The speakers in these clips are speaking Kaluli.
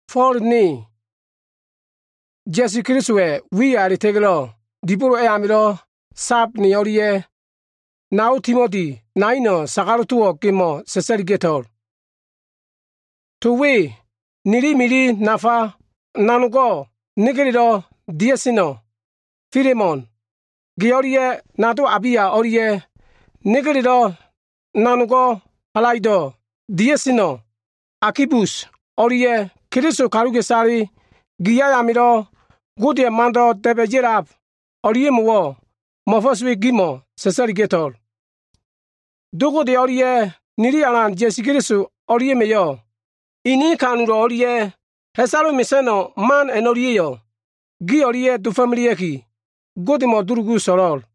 Fo꞉l, ne Ya꞉su Kelisowa꞉ wiya a꞉la꞉ta꞉ga꞉lo꞉ dibolo amilo꞉ so꞉l ne o꞉lia꞉ nao Timoti naino꞉ sagalo꞉ towo꞉ gemo꞉ sa꞉sa꞉liga꞉to꞉l. To we nili mili nafa nanogo꞉ negelelo꞉ dia꞉seno꞉, Filemon, ge o꞉lia꞉ nado Abia o꞉lia꞉ negelelo꞉ nanogo꞉ halaido꞉lo꞉ dia꞉seno꞉ Akibus o꞉lia꞉ Keliso kaluka꞉isale gi ayamilo꞉ Godeya꞉ mando꞉ da꞉ba꞉ ya꞉lab o꞉lia꞉mo꞉wo꞉, mo꞉fo꞉s we gimo꞉ sa꞉sa꞉liga꞉to꞉l. Do Gode o꞉lia꞉ nili Alan Ya꞉su Keliso o꞉lia꞉ma꞉yo꞉ ini ha꞉fo꞉ disa꞉lan man o꞉lia꞉ ha꞉salo꞉ mesa꞉no꞉ man a꞉no꞉lia꞉yo꞉ gi o꞉lia꞉ dofo꞉melea꞉ki, Godemo꞉ dulugu so꞉lo꞉l.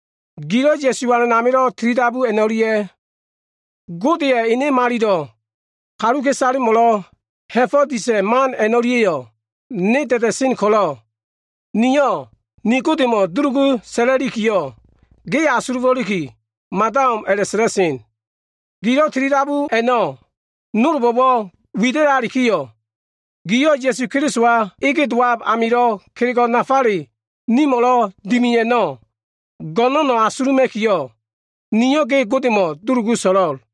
Gilo꞉ Ya꞉su Alan amilo꞉ tilidabu a꞉no꞉lia꞉, Godeya꞉ ene malilo꞉ kaluka꞉isalemo꞉lo꞉ ha꞉fo꞉ disa꞉ man a꞉no꞉lia꞉yo꞉ ne da꞉da꞉sen ko꞉lo꞉, niyo꞉ nili Godemo꞉ dulugu sa꞉la꞉likiyo꞉, ge asulufo꞉liki mada o꞉m a꞉la꞉sa꞉la꞉sen. Gilo꞉ tilidabu a꞉no꞉ nolbo꞉wo꞉ wida꞉lalikiyo꞉, giyo꞉ Ya꞉su Kelisowa dowab amilo꞉ kelego꞉ nafale nimo꞉lo꞉ dimi a꞉no꞉ go꞉no꞉no꞉ fanda asululima꞉ki, niyo꞉ ge Godemo꞉ dulugu so꞉lo꞉l.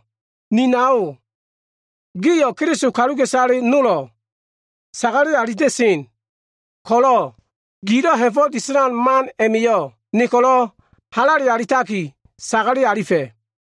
Ni nao, giyo꞉ Keliso kaluka꞉isale nolo꞉ sagale alifela꞉sen ko꞉lo꞉, gilo꞉ ha꞉fo꞉ disa꞉lan man a꞉ma꞉yo꞉ ne ko꞉lo꞉ halale alitaki, sagale alifa꞉.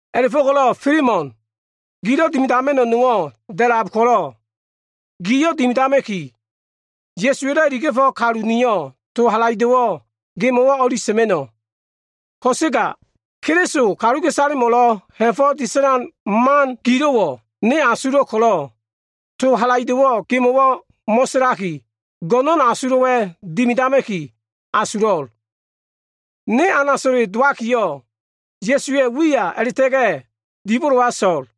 A꞉la꞉fo꞉ko꞉lo꞉ Filemon, gilo꞉ dimidama꞉no꞉wo꞉ nowo꞉ da꞉lab ko꞉lo꞉, giyo꞉ dimidama꞉ki, Ya꞉suwa꞉lo꞉ iliga꞉felo꞉ kalu niyo꞉ to halaido꞉wo꞉ gemo꞉wo꞉ o꞉li sa꞉ma꞉no꞉. Ko꞉sega Keliso kaluka꞉isalemo꞉lo꞉ ha꞉fo꞉ disa꞉la꞉sen man gilo꞉wo꞉ ne asulo꞉ ko꞉lo꞉ to halaido꞉wo꞉ gemo꞉wo꞉ mo꞉sa꞉laki, go꞉no꞉n asulo꞉wa꞉ dimidama꞉ki, asulo꞉l. Ne anaso꞉le dowakiyo꞉, Ya꞉su Kelisowa꞉ wiya a꞉la꞉ta꞉ga꞉ dibolowa so꞉l.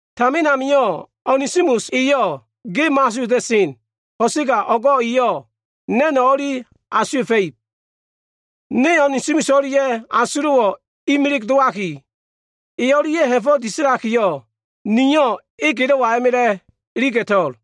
Tamin amio꞉ Onesimus eyo꞉ ge mo꞉asuwa꞉ta꞉sen ko꞉sega o꞉go꞉ eyo꞉ na꞉no꞉ o꞉li asuwa꞉fa꞉ib. Ne Onesimus o꞉lia꞉yo꞉ asulo꞉wo꞉ imilig dowaki, e o꞉lia꞉ ha꞉fo꞉ disa꞉lakiyo꞉, niyo꞉ e gelo꞉wa a꞉ma꞉la꞉ iliga꞉to꞉l.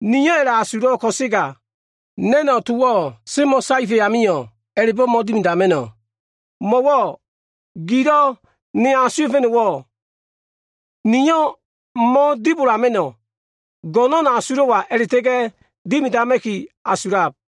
Niyo꞉ a꞉la꞉asulo꞉ ko꞉sega, na꞉no꞉ towo꞉ semo꞉saefa꞉ amio꞉, a꞉la꞉bo꞉ mo꞉dimidama꞉no꞉. Mo꞉wo꞉ gilo꞉ ne asuwa꞉fa꞉no꞉wo꞉, niyo꞉ mo꞉dibodama꞉no꞉, go꞉no꞉n asulo꞉wa a꞉la꞉ta꞉ga꞉ dimidama꞉ki asulab.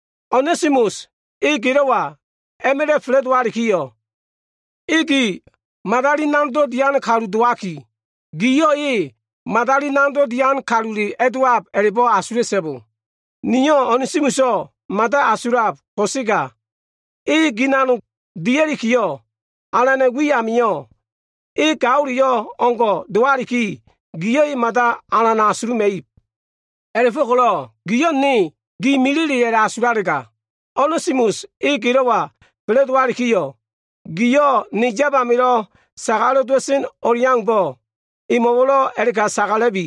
Onesimus e gelo꞉wa a꞉ma꞉la꞉ fa꞉la꞉dowalikiyo꞉, e gi madali nanogdo꞉ dian kalu dowaki, giyo꞉ e madali nanogdo꞉ dian kalule a꞉dowab a꞉la꞉bo꞉ asula꞉so꞉bo. Niyo꞉ Onesimuso꞉ mada asulab ko꞉sega, e gi nanog dialikiyo꞉, Alana꞉ wi amio꞉ e gaoleyo꞉ o꞉ngo꞉ dowaliki, giyo꞉ e mada alan asuluma꞉ib. A꞉la꞉fo꞉ko꞉lo꞉ giyo꞉ ne gi milile a꞉la꞉asulalega, Onesimus e gelo꞉wa fa꞉la꞉dowalikiyo꞉, giyo꞉ ne yab amilo꞉ sagalo꞉ dowa꞉sen o꞉leaumbo꞉, emo꞉wo꞉lo꞉ a꞉la꞉ka sagala꞉bi.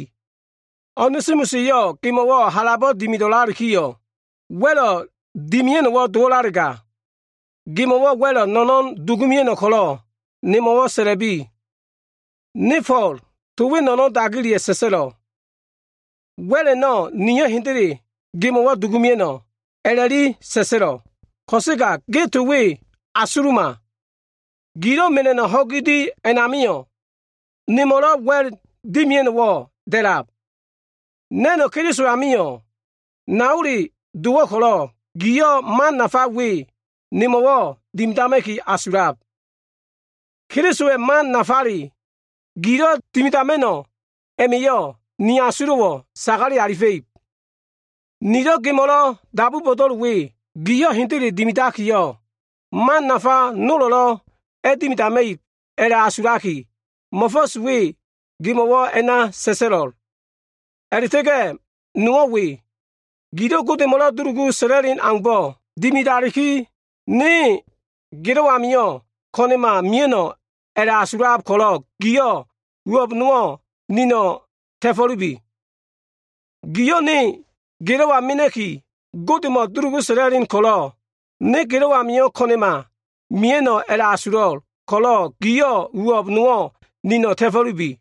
Onesimus eyo꞉ gemo꞉wo꞉ halabo꞉ dimido꞉lalikiyo꞉, wa꞉lo꞉ dimia꞉no꞉wo꞉ dowo꞉lalega, gemo꞉wo꞉ wa꞉lo꞉ no꞉no꞉n dugumia꞉no꞉ ko꞉lo꞉ nemo꞉ sa꞉la꞉bi. Ne Fo꞉l, to we no꞉no꞉n dagileya꞉ sa꞉sa꞉lo꞉l, “Wa꞉l a꞉no꞉ niyo꞉ hendele gemo꞉wo꞉ dugumia꞉no꞉” a꞉la꞉li sa꞉sa꞉lo꞉. Ko꞉sega ge to we asuluma. Gilo꞉ mela꞉no꞉ ho꞉gi di a꞉namio꞉, nemo꞉lo꞉ wa꞉l mea꞉no꞉wo꞉ da꞉lab. Na꞉no꞉ Keliso amio꞉ naole dowo꞉ ko꞉lo꞉, giyo꞉ man nafa we nemo꞉wo꞉ dimidama꞉ki asulab. Kelisowa꞉ man nafa gilo꞉ dimidama꞉no꞉ a꞉ma꞉yo꞉, ni asulo꞉wo꞉ sagale alifa꞉ib. Nilo꞉ gemo꞉lo꞉ dabu bo꞉do꞉l we, giyo꞉ hendele dimidakiyo꞉, man nafa nolo꞉lo꞉ a꞉dimidama꞉ib a꞉la꞉asulaki, mo꞉fo꞉s we gemo꞉wo꞉ a꞉na sa꞉sa꞉lo꞉l. A꞉la꞉ta꞉ga꞉ nowo꞉ we. Gilo꞉ Godemo꞉lo꞉ dulugu sa꞉la꞉len aumbo꞉ dimidaliki, ne gelo꞉ amio꞉ ko꞉na꞉ma mia꞉no꞉ a꞉la꞉asulab ko꞉lo꞉ giyo꞉ uwo꞉b nowo꞉ nino꞉ ta꞉fo꞉lubi. Giyo꞉ ne gelo꞉wa mena꞉ki Godemo꞉ dulugu sa꞉la꞉len ko꞉lo꞉, ne gelo꞉ amio꞉ ko꞉na꞉ma mia꞉no꞉ a꞉la꞉asulo꞉ ko꞉lo꞉, giyo꞉ uwo꞉b nowo꞉ nino꞉ ta꞉fo꞉lubi.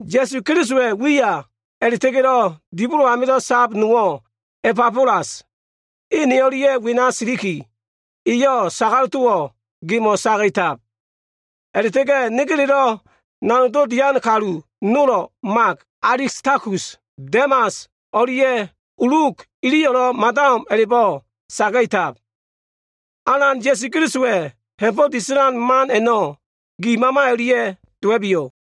Ya꞉su Kelisowa꞉ wiya a꞉la꞉ta꞉ga꞉lo꞉ dibolo amilo꞉ sab nowo꞉ Ebafelas, e ne o꞉lia꞉ wena siliki, eyo꞉ sagalo꞉ towo꞉ gemo꞉ saga꞉tab. A꞉la꞉ta꞉ga꞉ negelelo꞉ nanog dian kalu nolo꞉ Mak, Alistakus, Demas o꞉lia꞉ Luk iliyo꞉lo꞉ mada o꞉m a꞉la꞉bo꞉ saga꞉tab. Alan Ya꞉su Kelisowa꞉ ha꞉fo꞉ disa꞉lan man a꞉no꞉ gi mama o꞉lia꞉ dowa꞉biyo꞉.